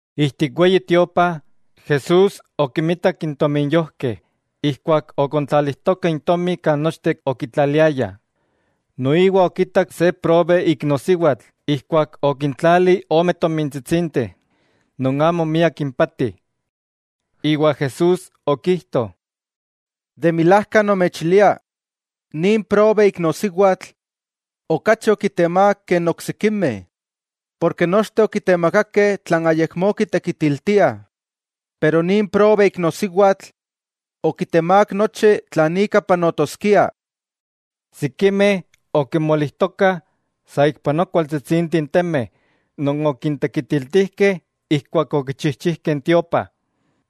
Ijtik Weyi Tiopa, Jesús okimitak n tominyojkeh ijkuak okontlalijtokah intomi kan nochteh okitlaliaya. Noiwa okitak se probe iknosiwatl ijkuak okintlali ome tomintsitsinteh non amo miak impati. Iwa Jesús okijto: —De milajka nomechilia, nin probe iknosiwatl, okachi okitemák ke n oksikimeh; porke nochteh okitemakakeh tlan ayakmó kitekitiltiah, pero nin probe iknosiwatl okitemák nochi tlan ika panotoskia. Sikimeh okimolijtokah saikpanoa kualtsitsinteh n temeh non okintekitiltijkeh ijkuak okichijchijkeh n Weyi Tiopa,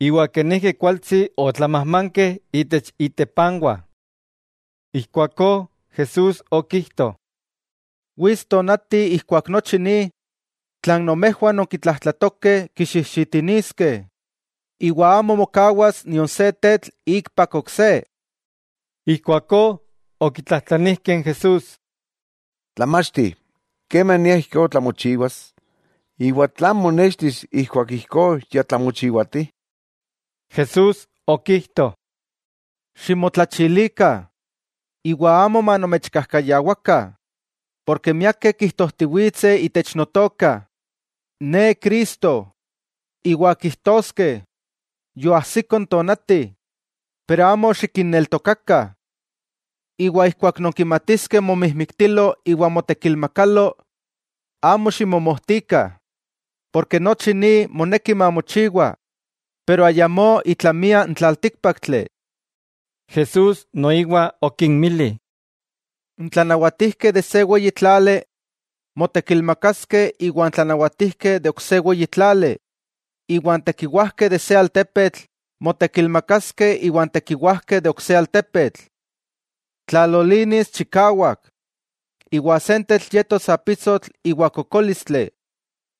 iwa kenijki kualtsi otlamajmankeh itech itepanwah. Ijkuakó Jesús okijto: —Wits tonati ijkuak nochi ni tlan nomejwah nonkitlajtlatokeh kixijxitiniskeh, iwa amo mokawas nion se tetl ikpak ok se. Ijkuakó okitlajtlanijkeh n Jesús: —Tlamachti, ¿kemania ijkó tlamochiwas?, iwa ¿tlan monextis ijkuak ijkó ya tlamochiwati? Jesús okijto: —Ximotlachilikah, iwa amo manomechkajkayawakah. Porke miakeh kijtojtiwitseh itech Notoka: “Ne Cristo”; iwa kijtoskeh: “Yoajsiko n tonati.” Amo xikinneltokakah. Keman nonkimatiskeh momijmiktilo iwa motekilmakalo, amo ximomojtikah, nochi ni moneki mamochiwa, pero ayamó itlamia n tlaltíkpaktli. Jesús noiwa okinmili: —N tlanawatijkeh de se weyi tlali motekilmakaskeh iwa n tlanawatijkeh de ok se weyi tlali, iwa n tekiwajkeh de se altepetl motekilmakaskeh iwan tekiwajkeh de ok se altepetl. Tlalolinis chikawak, iwa sentetl yetos apisotl iwa kokólistli,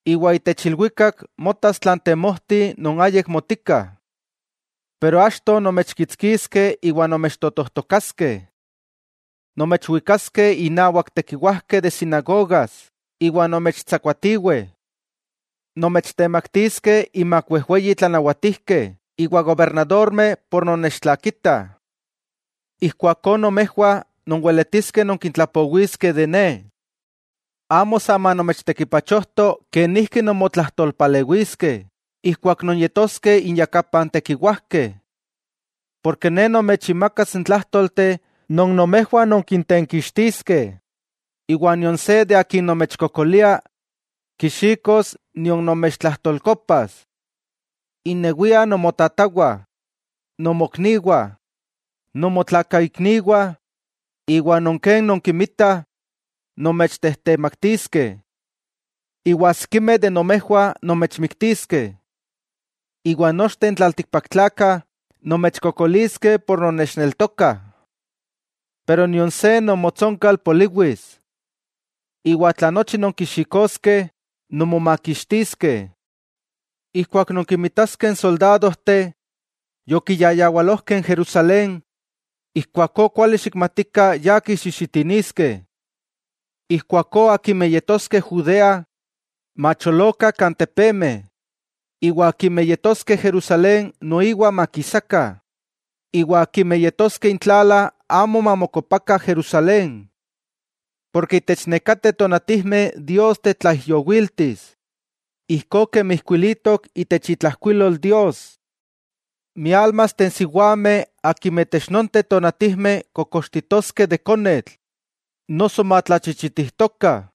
iwa itech ilwikak motas tlan temojti non ayik motika. 'Pero achto, nomechkitskiskeh iwa nomechtotojtokaskeh. Nomechwikaskeh innawak tekiwajkeh de sinagogas iwa nomechtsakuatiweh. Nomechtemaktiskeh inmak wejweyi tlanawatijkeh iwa gobernadormeh por nonnechtlakitah. Ijkuakó nomejwah nonweletiskeh nonkintlapowiskeh de Ne. Amo sa manomechtekipachojto kenijki nonmotlajtolpalewiskeh ijkuak nonyetoskeh inyakapah n tekiwajkeh, porke Ne nomechinmakas n tlájtolteh non nomejwah nonkintenkixtiskeh, iwa nion se de akin nomechkokolia kixikos nion nomechtlajtolkopas. Innewiah nomotajwah, nomokniwah, nomotlakaikniwah iwa non ken nonkinmitah nomechtejtemaktiskeh. Iwa sikimeh de nomejwah nomechmiktiskeh, iwa nochteh n tlaltikpaktlakah nomechkokoliskeh por nonnechneltokah, pero nion se nomotsonkal poliwis. 'Iwa tla nochi nonkixikoskeh, nonmomakixtiskeh. 'Ijkuak nonkinmitaskeh n soldadojteh yokiyayawalojkeh n Jerusalén, ijkuakó kuali xikmatikah ya kixijxitiniskeh. Ijkuakó, akimeh yetoskeh Judea, macholokah kan tepemeh; iwa akimeh yetoskeh Jerusalén noiwa makisakah, iwa akimeh yetoskeh intlala amo mamokopakah Jerusalén. Porke itech nekateh tonatijmeh Dios tetlaijyowiltis, ijkó kemi ijkuilitok itech itlajkuilol Dios. ¡Miálmasteh n siwameh akimeh itech nonteh tonatijmeh kokoxtitoskeh de konetl noso matlachichitijtokah!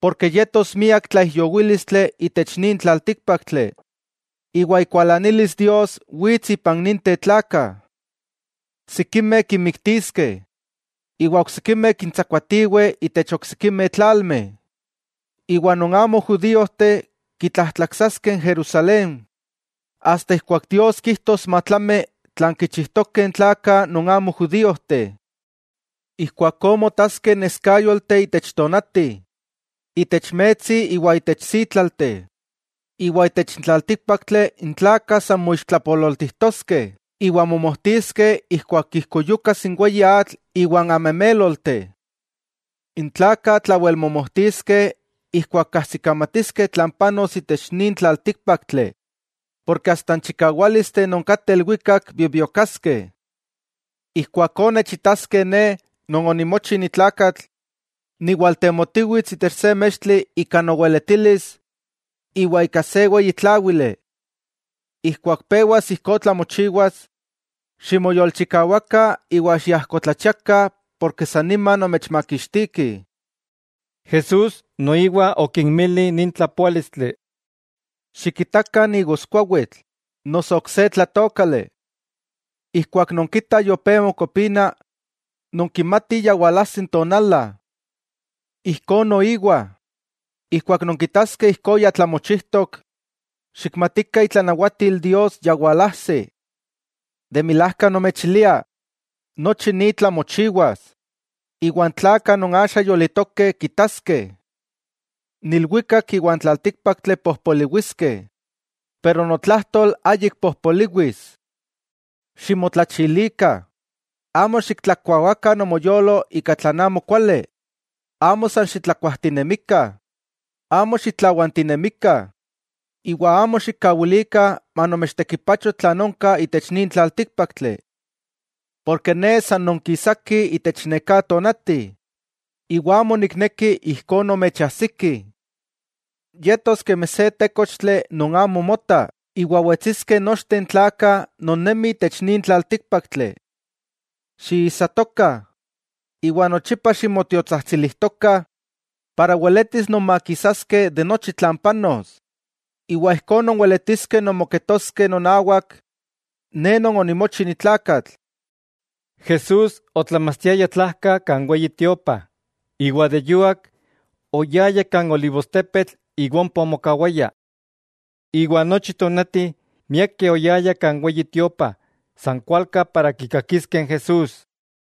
Porke yetos miak tlaijyowílistli itech nin tlaltíkpaktli, iwa ikualanilis Dios wits ipan ninteh tlakah. Sikimeh kinmiktiskeh, iwa oksikimeh kintsakuatiweh itech oksikimeh tlalmeh. Iwa non amo judíojteh kitlajtlaksaskeh n Jerusalén, asta ijkuak Dios kijtos matlami tlan kichijtokeh n tlakah non amo judíojteh. 'Ijkuakó motaskeh neskáyolteh itech tonati, itech metsi iwa itech sítlalteh; iwa itech n tlaltíkpaktli n tlakah san moixtlapololtijtoskeh iwa momojtiskeh ijkuak ijkuyukas n weyi atl iwa n amemélolteh. N tlakah tlawelmomojtiskeh ijkuak kajsikamatiskeh tlan panos itech nin tlaltíkpaktli; porke asta n chikawálisteh non kateh ilwikak bibiokaskeh. Ijkuakó nechitaskeh Ne Non onimochi ni tlakatl, niwaltemotiwits itech se mextli ika noweletilis iwa ika se weyi tláwili. Ijkuak pewas ijkó tlamochiwas, ximoyolchikawakah iwa xiajkotlachiakah porke san nima nomechmakixtikih. Jesús noiwa okinmili nin tlapoálistli: —Xikitakah n igoskuawitl, noso ok se tlatookali. Ijkuak nonkitah yopé mokopina, nonkimatih ya walajsi n tonala. Ijkó noiwa, ijkuak nonkitaskeh ijkó ya tlamochijtok, xikmatikah itlanawatil Dios ya walajsi. 'De milajka nomechilia, nochi ni tlamochiwas, iwa n tlakah non axa yolitokeh kitaskeh. N ilwikak iwa n tlaltíkpaktli pojpoliwiskeh, pero notlajtol ayik pojpoliwis. 'Ximotlachilikah; amo xiktlakuawakah nomoyolo ika tlan amo kuali, amo san xitlakuajtinemikah, amo xitlawantinemikah iwa amo xikkawilikah manomechtekipacho tlan onka itech nin tlaltíkpaktli. Porke Ne san nonkisaki itech neká tonati, iwa amo nikneki ijkó nomechajsiki. Yetos kemi se tékochtli non amo mota iwa wetsiskeh nochteh n tlakah non nemi itech nin tlaltíkpaktli. Xiijsatokah, iwa nochipa ximotiotsajtsilijtokah para weletis nonmakisaskeh de nochi tlan panos, iwa ijkó nonweletiskeh nonmoketoskeh nonawak Ne Non onimochi ni tlakatl. Jesús otlamachtiaya tlajka kan Weyi Tiopa, iwa de yuak, oyaya kan olivostepetl iwa ompa omokawaya. Iwa nochi tonati, miakeh oyayah kan Weyi Tiopa san kualka para kikakiskeh n Jesús.